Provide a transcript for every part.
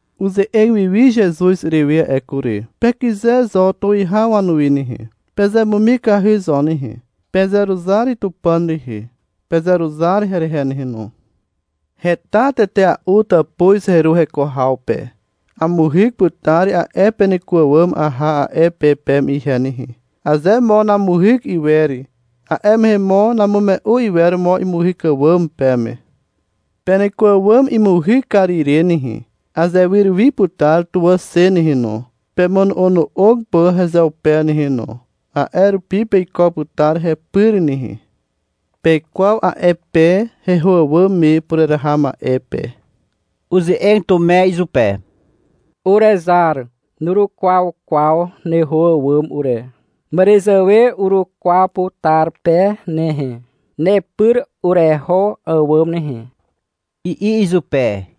Uze'eg wiwi Zezuz urewe a'e kury. — Pekyze zo tuwihaw wanuwi nehe, pezemumikahy zo nehe. Pezeruzar Tupàn rehe, pezeruzar herehe nehe no. Heta tetea'u tàpuz heru heko haw pe. Amuhyk putar a'e peneko àwàm aha a'e pe peme ihe nehe. Aze mo namuhyk iwer, a'e mehe mo namume'u iwer mo imuhyk àwàm peme. Peneko àwàm imuhyk kar ire nehe, azewyr wi putar tuwà xe nehe no, pemono'ono'og pà hezeupe nehe no. A'e rupi peiko putar hepyr nehe. Pekwaw a'e pe heho àwàm me pureraha ma'e pe. Uze'eg Tume izupe. — Urezar, nurukwaw kwaw neho àwàm ure. Màràzàwe urukwaw putar pe nehe, nepyr ureho àwàm nehe, i'i izupe.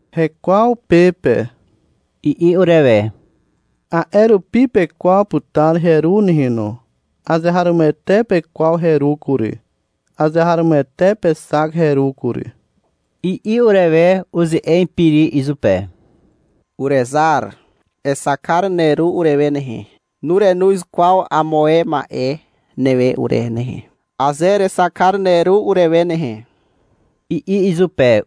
— Hekwaw pe pe, i'i urewe. — A'e rupi pekwaw putar heru nehe no. Azeharomoete pekwaw heru kury. Azeharomoete pexak heru kury, i'i urewe. Uze'eg Piri izupe. — Urezar, exak kar neru urewe nehe. Nurenoz kwaw amo ae ma'e newe ure nehe, aze erexak kar neru urewe nehe, i'i izupe.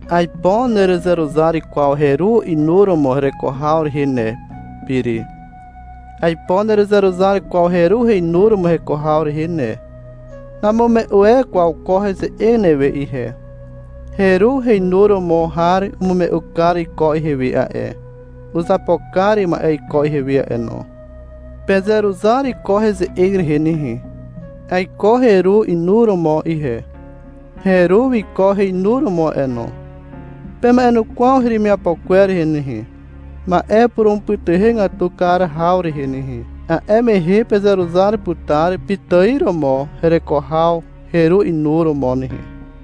— Aipo nerezeruzar kwaw heru inuromo hereko haw rehe ne, Piri. Aipo nerezeruzar kwaw heru heinuromo heko haw rehe ne. Namume'u e kwaw ko heze'eg newe ihe. Heru heinuromo har umume'u kar iko ihewe a'e, uzapo kar ma'e iko ihewe a'e no. Pezeruzar ko heze'eg rehe nehe. Aiko heru inuromo ihe. Heru wiko heinuromo a'e no. Pema'enukwaw heremiapo kwer rehe nehe, ma'e purumupytuhegatu kar haw rehe nehe. A'e mehe pezeruzar putar pitài romo hereko haw heru inuromo nehe.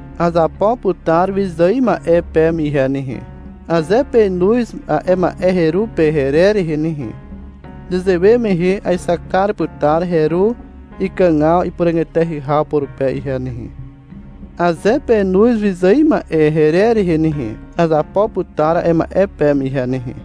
Azapo putar wyzài ma'e peme ihe nehe, aze penoz a'e ma'e heru pe herer rehe nehe. Nezewe mehe aexak kar putar heru ikàgaw ipuràg eteahy haw purupe ihe nehe. Aze penoz wyzài ma'e herer rehe nehe, azapo putar a'e ma'e peme ihe nehe.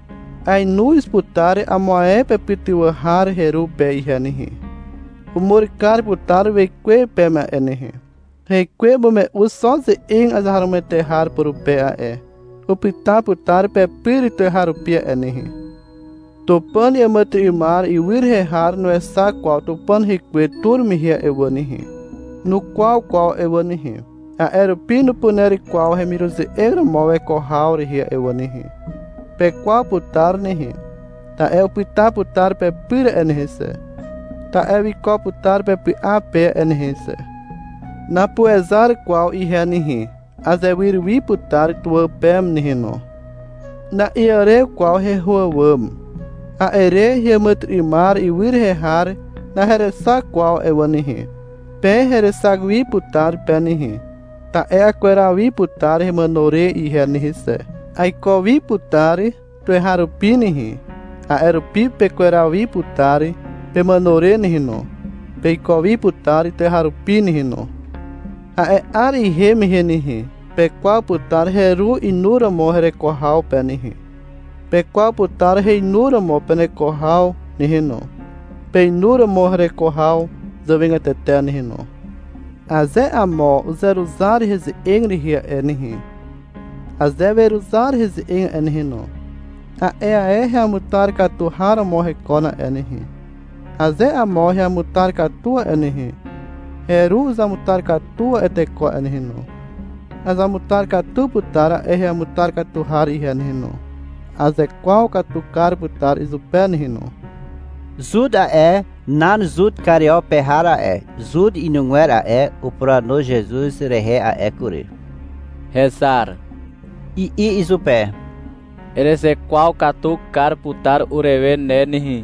Aenoz putar amo ae pepytywà har heru pe ihe nehe. Umur kar putar wekwe peme a'e nehe. Hekwe umume'u xo ze'eg azeharomoete har purupe a'e. Upyta putar pepyr tuweharupi a'e nehe. Tupàn iàmàtyry'ymar ywy rehe har nuexak kwaw Tupàn rekwe tur mehe a'e wà nehe, nukwaw kwaw a'e wà nehe. A'e rupi nupuner kwaw hemiruze'eg romo weko haw rehe a'e wà nehe. Pekwaw putar nehe, ta'e upyta putar pepyr a'e nehe xe, ta'e wiko putar pepy'a pe a'e nehe xe. Napuezar kwaw ihe nehe. Azewyr wi putar tuwà peme nehe no. Na'iàrew kwaw heho àwàm. A'e re heàmàtyry'ymar ywy rehe har naherexak kwaw a'e wà nehe. Pe herexak wi putar pe nehe. Ta'e akweraw wi putar hemàno re ihe nehe xe. Aiko wi putar tuweharupi nehe. A'e rupi pekweraw wi putar pemàno re nehe no. Peiko wi putar tuweharupi nehe no. A'e 'ar ihem mehe nehe, pekwaw putar heru inuromo hereko haw pe nehe. Pekwaw putar heinuromo peneko haw nehe no, peinuromo hereko haw zàwegatete nehe no. Aze amo uzeruzar heze'eg rehe a'e nehe, aze weruzar heze'eg a'e nehe no, a'e ae heamutar katu har romo hekon a'e nehe. Aze amo heamutar katu a'e nehe, heru uzamutar katu a'e teko a'e nehe no. Azamutar katu putar a'e heamutar katu har ihe nehe no. Azekwaw katu kar putar izupe ihe nehe no. Zut a'e (nan Zut Kario pe har a'e, Zut inugwer a'e) upuranu Zezuz rehe a'e kury. — Hezar, i'i izupe. — Erezekwaw katu kar putar urewe ne nehe.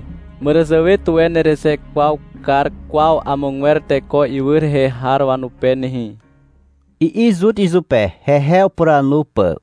Màràzàwe tuwe nerezekwaw kar kwaw amogwer teko ywy rehe har wanupe nehe, i'i Zut izupe, hehe upuranu pà.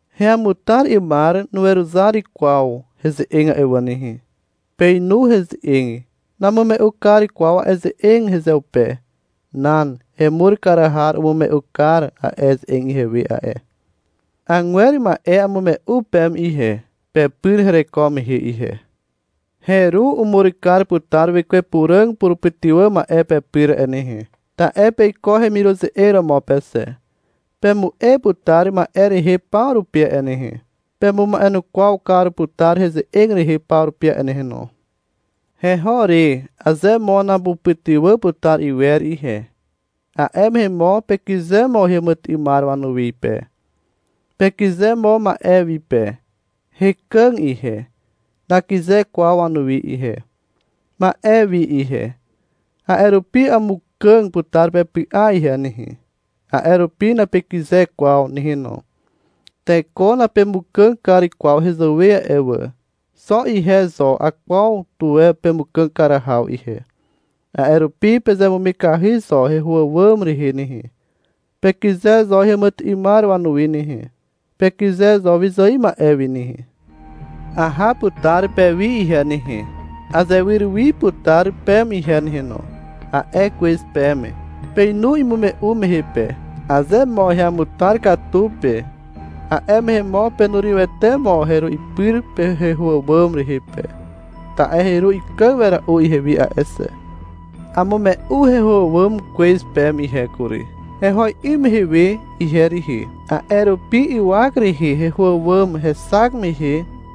Heamutar 'ymar nuweruzar kwaw heze'eg a'e wà nehe. Peinu heze'eg. Namume'u kar kwaw a'e ze'eg hezeupe. Nan. Hemur kar har umume'u kar a'e ze'eg ihewe a'e. Agwer ma'e amume'u peme ihe, pepyr hereko mehe we ihe. Heru umur kar putar Wekwe Puràg purupytywà ma'e pepyr a'e nehe, ta'e peiko heremiruze'eg romo pe xe. Pemu'e putar ma'e rehe paw rupi a'e nehe. Pemuma'enukwaw kar putar heze'eg rehe paw rupi a'e nehe no. Heho re, aze mo napupytywà putar iwer ihe, a'e mehe mo pekyze mo heàmàtyry'ymar wanuwi pe, pekyze mo ma'e wi pe. Hekàg ihe. Nakyze kwaw wanuwi ihe, ma'e wi ihe. A'e rupi amukàg putar pepy'a ihe nehe. A'e rupi napekyze kwaw nehe no. Teko napemukàg kar kwaw hezàwe a'e wà. Xo ihe zo akwaw tuwe pemukàg kar haw ihe. A'e rupi pezemumikahy zo heho àwàm rehe nehe. Pekyze zo heàmàtyry'ymar wanuwi nehe. Pekyze zo wyzài ma'e wi nehe. — Aha putar pewi ihe nehe, azewyr wi putar peme ihe nehe no, a'e kwez peme. Peinu imume'u mehe pe. Aze mo heamutar katu pe, a'e mehe mo penurywete mo heru ipyr heho àwàm rehe pe, ta'e heru ikàg wera'u ihewi a'e xe. Amume'u heho àwàm kwez peme ihe kury, heho 'ym mehe we ihe rihi. A'e rupi ywak rehe heho àwàm hexak mehe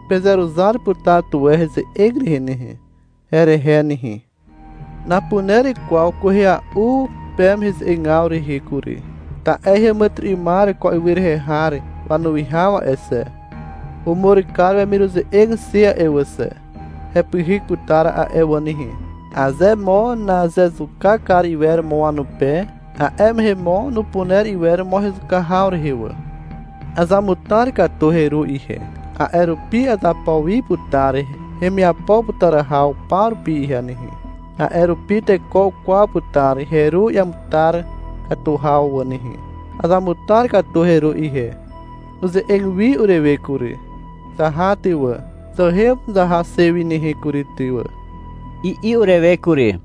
pezeruzar putar tuwe heze'eg rehe nehe, herehe nehe. Napuner kwaw kwehea'u peme heze'egaw rehe kury, ta'e heàmàtyry'ymar ko ywy rehe har wanuwihaw a'e xe, umur kar wemiruze'eg xe a'e wà xe: hepyhyk putar a'e wà nehe. Aze mo nazezuka kar iwer mo wanupe, a'e mehe mo nupuner iwer mo hezuka haw rehe wà. Azamutar katu heru ihe. A'e rupi azapo wi putar hemiapo putar haw paw rupi ihe nehe. A'e rupi teko ukwaw putar heru iamutar katu haw a'e wà nehe. Azamutar katu heru ihe. Uze'eg wi urewe kury. — Zaha ty wà, zahem zaha xe wi nehe kury ty wà, i'i urewe kury.